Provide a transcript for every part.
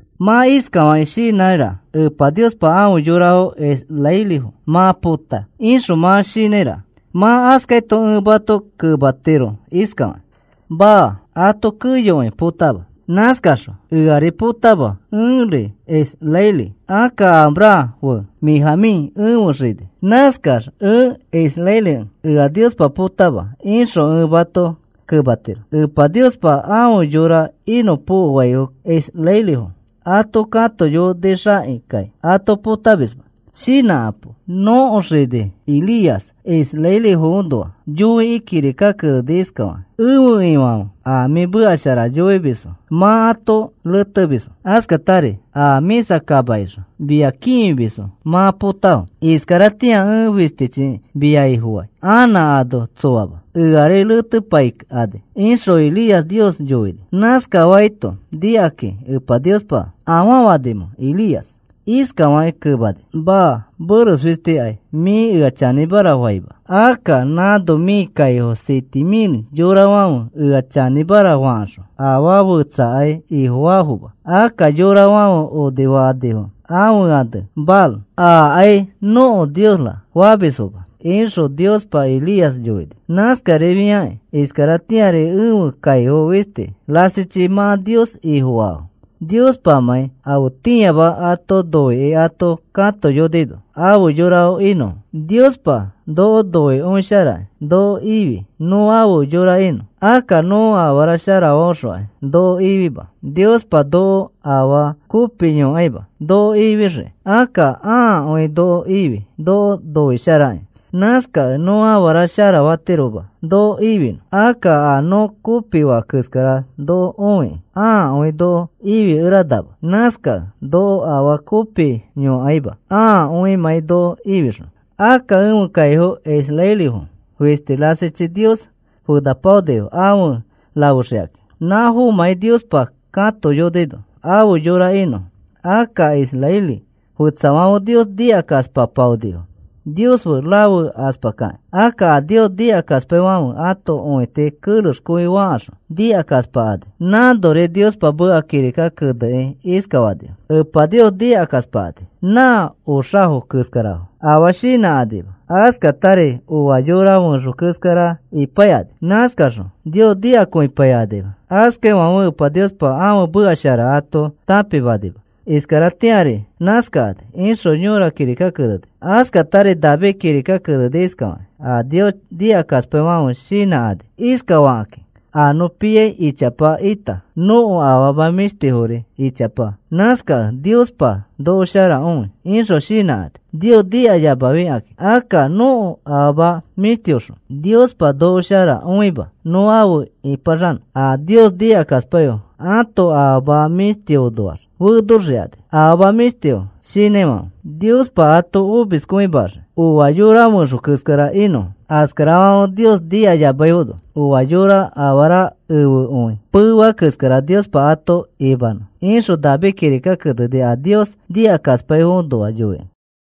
Mã iskafakĩ shinãiraka: “Epa Niospa afe yorafo israelifo mã pota,” ixõ mã shinãiraka. Mã askaito ẽ mato kematiro iskafakĩ: “Maa, ato keyokõi potama. Nãskaxõ eari potama ẽri israeli. Akka Abraham fe Benjamín ẽfe xini. Nãskax ẽ israelikẽ ea Niospa potama,” ixõ ẽ mato kematiro. Epa Niospa afe yora inõpokoaifo israelifo ato katoyonixakĩkai ato potamisma. Shinãkapo. Nõko xini Elías israelifoõnoa yoikĩ kirika keneni iskafakĩ: “Ẽfe Ifãfe, a mĩ meka shara yoimisfo mã ato retemisfo. Askatari a mĩsa kamakixõ mia kĩfimisfo mã potafo. Iskaratĩa ẽ fistichi mia Ifofai. Anã ano tsoama. Eari retepaikani,” ixõ Elías Nios yoini. Nãskafaito nikakĩ Epa Niospa ¿afaa fanimẽ, Elías? Iskafakĩ kemani: “Maa. Meres fistikai mĩ ea chanĩmara faima. Akka nãno mĩ kaifo siete mil yorafãfe ea chanĩmara fakaxõ afaa fetsakai ifofaafoma. Akka yorafãfe onifanifo ãfe ane Baal, ‘Akai nõko niosra,’ famisfoma,” ixõ Niospa Elías yoini. Nãskarifiakĩ iskaratĩari ẽfe kaifo fisti rasichi mã Nios Ifofaafo, Niospamãi afetĩama ato noikĩ ato katoyonino afe yora inõfo. Niospa noko noikõisharakĩ noko ifi nõ afe yora inõ. Akka nõ afara sharafaõxokai noko ifima. Niospa noko afaa kopi yõkaima noko ifixiki. Akka ãakõi noko ifi noko noisharakĩ. Nãskakẽ nõ afara sharafatiroma noko ifinõ. Akka a nõ kopifa keskara noko õikĩ ãakõi noko ifikeranama. Nãskakẽ noko afaa kopi yõkaima ãakõimãi noko ifixõ. Akka ẽfe kaifo israelifo fisti rasichi Nios fenapaonifo afe rafexikakĩ, nãfomãi Niospa katoyonino afe yora inõfo. Akka israeli fetsafãfe Nios nikakaspapaonifo Nios fe rafekaspakakĩ. Akka a Nios nikakaspaifãfe ãto õiti kerexkõifakaxõ nikakaspakani. Nãnori Niospa meka kirika kenekakĩ iskafanifo: “Epa Nios nikakaspakani nã oxafo keskarafo afaa shinãkanima. Askatari oa yora fẽxo keskara ipaikani. Nãskaxõ Nios nikakõipaikanima. Askafaifãfe Epa Niospa ãfe meka shara ato tãpimanima. Iskaratĩari nãskakani,” ixõ yõra kirikaki keneni. Askatari David kirika keneni iskafakĩ: A Nios nikakaspaifãfe shinãkani iskafakakĩ: “A nõ piai ichapa ita nõko afama mĩshtifori ichapa. Nãskakẽ Niospa noko shara õi,” ixõ shinãkani, Nios nikayamafikakĩ. Akka nõko afama mĩshtiõxõ Niospa noko shara õima nõ afe ĩpaxanõ. A Nios nikakaspaifo ãto afama mĩshtiõnoax fenoxikani afama mĩshtifo shinãifãfe. Niospa ato omiskõimaxii. Oa yora fẽxo keskara inõfo. Askarafãfe Nios nikayamaifono oa yora afara efekõi pefea keskara Niospa ato imanõ, ixõ David kirika keneni a Nios nikakaspaifoõnoa yoikĩ.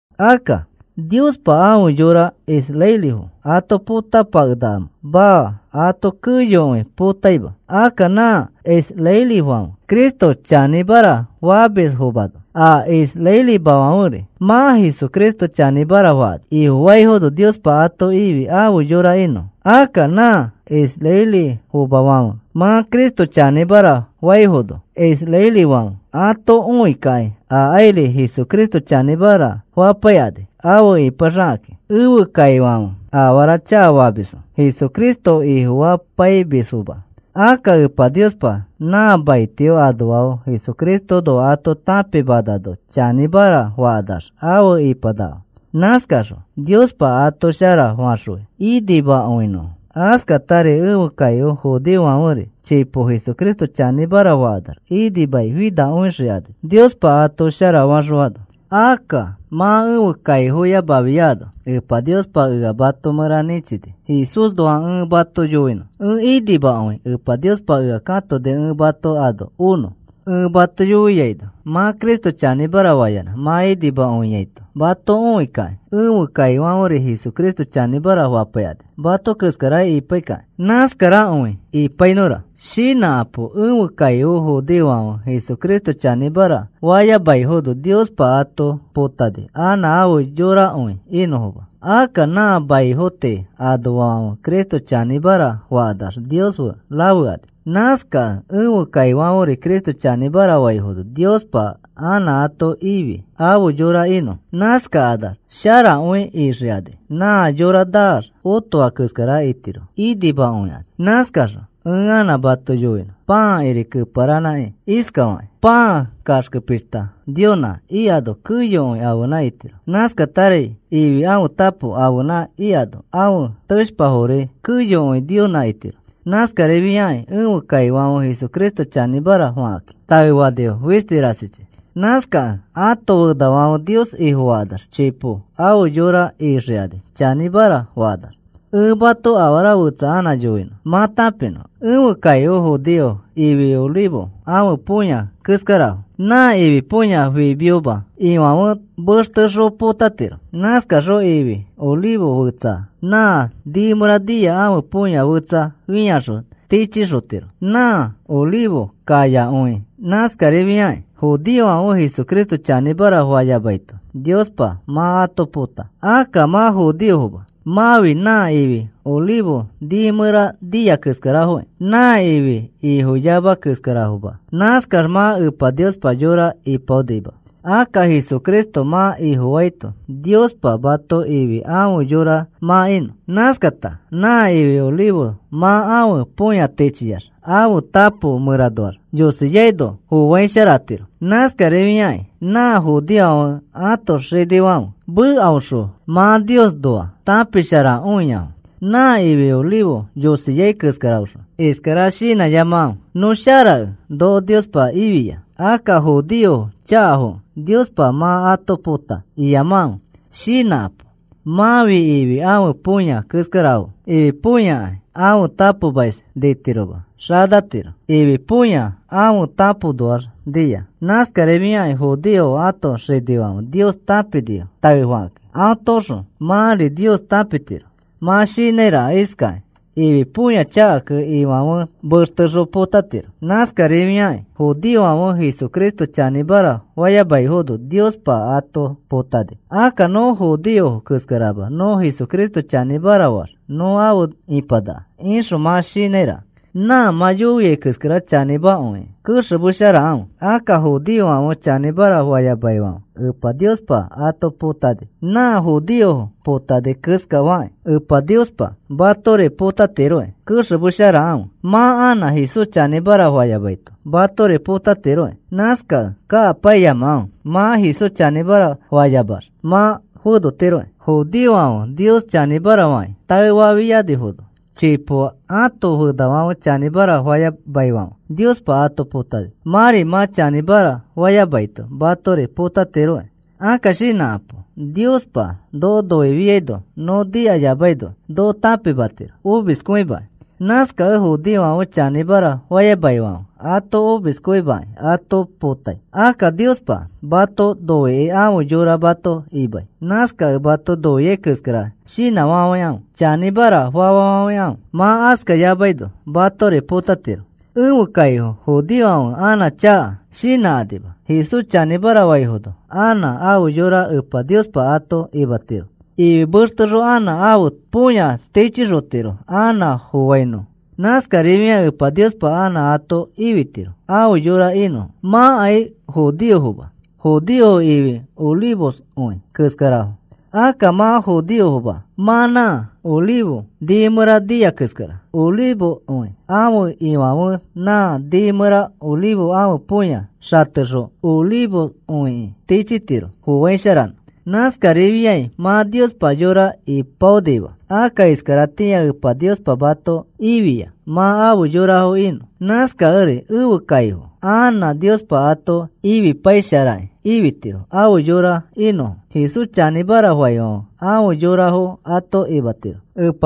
Akka, ¿Niospa afe yorafo israelifo ato potapakenakamẽ? Maa, ato keyokõi potaima. Akka nã israelifãfe Cristo chanĩmara famisfomano a israelimafãferi mã Jesucristo chanĩmara fakani. Ifofaifono Niospa ato ifi afe yora inõfo. Akka nã israelifomafãfe mã Cristo chanĩmara faifono israelifãfe ato õikakĩ akairi Jesucristo chanĩmara fapaikani afe ipaxakakĩ. Ẽfe kaifãfe, afara chakafamisfo Jesucristo Ifofapaimisfoma. Akka Epa Niospa nã maitio anoafo Jesucristoõnoa ato tãpimanano chanĩmara fakanax afe ipanakafo. Nãskaxõ Niospa ato shara faxõi, inimakõinõfo. Askatari ẽfe kaifo judeofãferi chipo Jesucristo chanĩmara fakanax inimai finakõixikani Niospa ato sharafaxõano. Akka mã ẽfe kaifoyamafiano Epa Niospa ea mato mẽra nĩchini Jesúsnoa ẽ mato yoinõ. Ẽ inimakõi Epa Niospa ea katoni ẽ mato ano onõ. Ẽ mato yoiaino mã Cristo chanĩmara fayanã mã inimakõiaito mato õikakĩ ẽfe kaifãferi Jesucristo chanĩmara fapaikani, mato keskara ipaikakĩ. Nãskarakõi ipainõfora. Shinãkapo. Ẽfe kaifo judeofãfe Jesucristo chanĩmara fayamaifono Niospa ato potani anã afe yorakõi inõfoma. Akka nã maifo tii anoafãfe Cristo chanĩmara fakanax Nios fe rafekani. Nãskakẽ ẽfe kaifãferi Cristo chanĩmara faifono Niospa anã ato ifi afe yora inõfo. Nãskakanax sharakõi ixikani. Nã yora naax otoa keskara itirofo, inimakõikani. Nãskaxõ ẽ anã mato yoinõ pãakiri keparanãkĩ iskafakĩ: Pãa kaxke pishta Niosnã ikano keyokõi ãfenã itiro. Nãskatari ifi ãfe tapo ãfenã ikano ãfe teshpafori keyokõi Niosnã itiro. Nãskarifiakĩ ẽfe kaifãfe Jesucristo chanĩmara fakakĩ taefanifo fisti rasichi. Nãskakẽ ãto fenafãfe Nios Ifofakanax chipo afe yora ixikani chanĩmara fakanax. Ẽ mato afara fetsa anã yoinõ mã tãpinõ. Ẽfe kaifo judeofo ifi olivo ãfe põya keskarafo. Nã ifi põya fimioma ifãfe mextexõ potatiro. Nãskaxõ ifi olivo fetsa nã nii mẽra nia ãfe põya fetsa fĩaxõ tichixotiro nã olivo kayakõiki. Nãskarifiakĩ judeofãfe Jesucristo chanĩmara fayamaito Niospa mã ato pota. Akka mã judeofoma. Mãfi nã ifi olivo nii mẽra nia keskarafokĩ. Nã ifi ifoyama keskarafo, mã. Nãskax mã Epa Niospa yora ipaonima. Akka Jesucristo mã Ifofaito Niospa mato ifi afe yora mã inõ. Nãskata nã ifi olivo mã ãfe põya tichiax ãfe tapo mẽranoax yosiaino foaisharatiro. Nãskarifiakĩ nã judeofãfe ãto xinifãfe mekaõxõ mã Niosnoa tãpisharakõiafo nã ifi olivo yosiai keskaraxõ. Iskara shinãyamakãfe: “Nõ sharakẽ noko Niospa ifia. Akka judeofo chakafokẽ Niospa mã ato pota,” iyamakãfe. Shinãkapo. Mãfi ifi ãfe põya keskarafo. Ifi põyakai ãfe tapomais nitiroma, xanatiro. Ifi põyafo aõ tapoõnoax nia. Nãskarifiakĩ judeofo ãto xinifãfe Nios tãpinifo taefakakĩ. Atoõxõ mãri Nios tãpitiro. Mã shinãiraka iskakĩ: “Ifi põya chakakẽ, ifãfe mextexõ põtatiro. Nãskarifiakĩ judeofãfe Jesucristo chanĩmara fayamaifono Niospa ato potani. Akka nõ judeofo keskarama nõ Jesucristo chanĩmara faax nõ afe ipanaka,” ixõ mã shinãiraka. Nã mã yoiai keskara chanĩmakõikĩ kexemesharakãfe. Akka judeofãfe chanĩmara fayamaifãfe Epa Niospa ato potani. Nã judeofo potani keskafakĩ Epa Niospa matori potatiroki. Kexemesharakãfe, mã anã Jesús chanĩmara fayamaito matori potatiroki. Nãskakẽ kakapaiyamakãfe. Mã Jesús chanĩmara fayamax mã fenotiroki. Judeofãfe Nios chanĩmara fakĩ taefafianifono chipo ãto fenafãfe chanĩmara fayamaifãfe Niospa ato potani. Mãri mã chanĩmara fayamaito matori potatiroki. Akka shinãkapo. Niospa noko noifiaino nõ nikayamaino noko tãpimatiro omiskõimakĩ. Nãskakẽ judeofãfe chanĩmara fayamaifãfe ato omiskõimakĩ ato potai. Akka Niospa mato noikĩ afe yora mato imai. Nãskakẽ mato noiai keskara shinãfafãikãfe. Chanĩmara fafafãikãfe. Mã askafayamaino matori potatiro. Ẽfe kaifo judeofãfe anã chaka shinãkakima, Jesús chanĩmara faifono anã afe yora Epa Niospa ato imatiro. Ifi mextexõ anã ãfe põya tichixotiro anã foainõ. Nãskarifiakĩ Epa Niospa anã ato ifitiro afe yora inõfo. Mãkai judeofoma. Judeofo ifi olivokõi keskarafo. Akka mã judeoma. Mã nã olivo nii mẽra nia keskara. Olivokõi ãfe ifãfe nã nii mẽra olivo ãfe põya xatexõ olivokõiki tichitiro foaisharanõ. Nãskarifiai mã Niospa yora ipaonima. Akka iskaratĩa Epa Niospa mato ifia mã afe yorafo inõ. Nãskakẽri ẽfe kaifo anã Niospa ato ifipaisharakĩ ifitiro afe yora inõfo. Jesús chanĩmara faifãfe afe yorafo ato imatiro.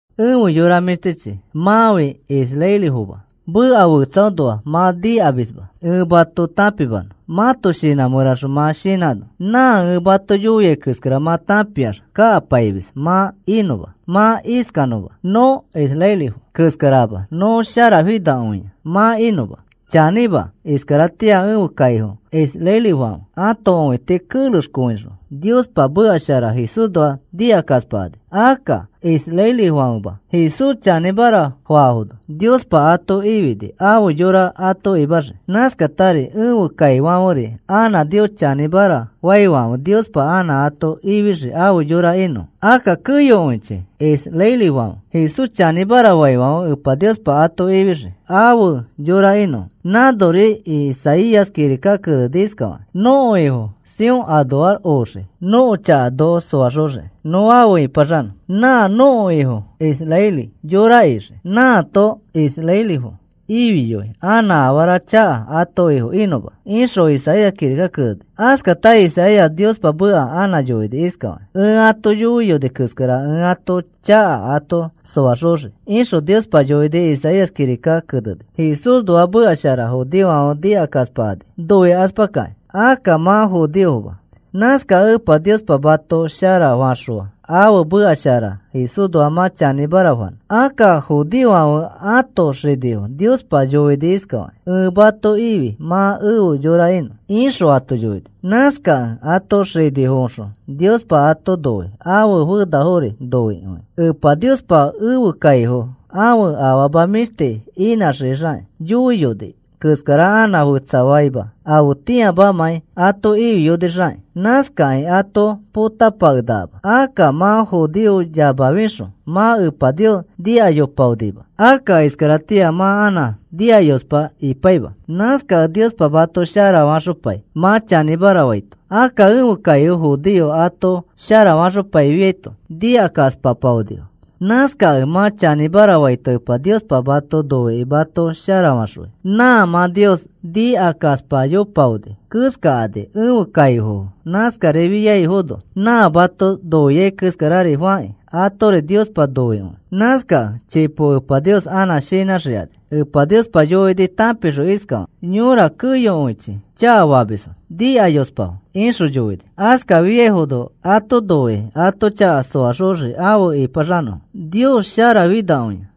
Efe yora mĩshtichi, mãfi israelifoma. Meka fetsaõnoa mã nikamisma ẽ mato tãpimanõ mãto shinã mẽraxõ mã shinãnõ, nã ẽ mato yoiai keskara mã tãpiax kakapaimis mã inõma, mã iskanõma: “Nõ israelifo keskarama, nõ sharafinakõia,” mã inõma. Chanĩma, iskaratĩa ẽfe kaifo israelifãfe ãto õiti kerexkõixõ Niospa meka shara Jesúsnoa nikakaspakani. Akka israelifãfema Jesús chanĩmara faafono Niospa ato ifini afe yora ato imaxii. Nãskatari ẽfe kaifãferi anã Nios chanĩmara faifãfe Niospa anã ato ifixii afe yora inõfo. Akka keyokõichi israelifãfe Jesús chanĩmara faifãfe Epa Niospa ato ifixii afe yora inõfo. Nãnori Isaías kirika keneni iskafakĩ: Nõko Ifo Sión anoax oxii nõko chaka noko soaxoxiki nõ afe ĩpaxanõ. Nã nõko Ifo israeli yora ixii. Nãato israelifo ifiyoi anã afara chaka ãto ifo inõma, ixõ Isaías kirika keneni. Askata Isaías Niospa meka anã yoini iskafakĩ: Ẽ ato yoiyoni keskara ẽ ãto chaka ato soaxoxii, ixõ Niospa yoini Isaías kirikaki keneni. Jesúsnoa meka shara judeofãfe nikakaspakani, noikaspakakĩ. Akka mã judeoma. Nãskakẽ Epa Niospa mato sharafaxõa ãfe meka shara Jesúsnoa mã chanĩmara fanõ. Akka judeofãfe ãto xinifo Niospa yoini iskafakĩ: “Ẽ mato ifi mã efe yora inõ,” ixõ ato yoini. Nãskakẽ ãto xinifoõxõ Niospa ato noi, ãfe fenafori noikõi. Epa Niospa ẽfe kaifo ãfe afama mĩshti inãxixakĩ yoiyoni keskara anã fetsafaima afetĩamamãi ato ifiyonixakĩ. Nãskakĩ ato potapakenakama. Akka mã judeoyamafixõ mã Epa Nios nikayopaonima. Akka iskaratĩa mã anã nikayospa ipaima. Nãskakẽ Niospa mato sharafaxopai mã chanĩmara faito. Akka ẽfe kaifo judeofo ato sharafaxopaifiaito nikakaspapaonifo. Nãskakẽ mã chanĩmara faito Epa Niospa mato noikĩ mato sharafaxõi. Nã mã Nios nikakaspayopaoni keskakani ẽfe kaifofo. Nãskafiaifono nã mato noiai keskari fakĩ atori Niospa noikõi. Nãskakẽ chipo Epa Nios anã shinãxikani. Epa Niospa yoini tãpixõ iskafakĩ: “Yora keyokõichi chakafamisfo, nikayospafo,” ixõ yoini. Askafiaifono ato noikĩ ato chaka soaxoxii afe ĩpaxanõfo.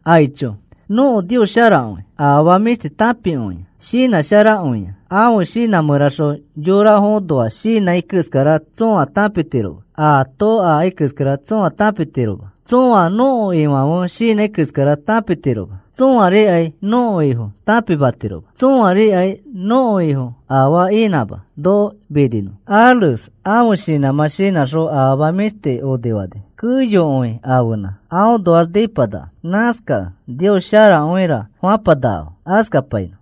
¡Aicho! ¡Nõko Nios sharakõi! Afama mĩshti tãpikõia. Shinãsharakõia. Ãfe shinã mẽraxõ yorafoõnoa shinãi keskara tsõa tãpitiroma. Aato akai keskara tsõa tãpitiroma. Tsõa nõko Ifãfe shinãi keskara tãpitiroma. Tsõarikai nõko Ifo tãpimatiroma. Tsõarikai nõko Ifo afaa inãma noko niminõ. Ares ãfe shinãmã shinãxõ afama mĩshti onifani. Keyokõi ãfenã. Aõnoax nipanaka. Nãskakẽ, “Nios sharakõira,” fapanakafo. Askapainõ.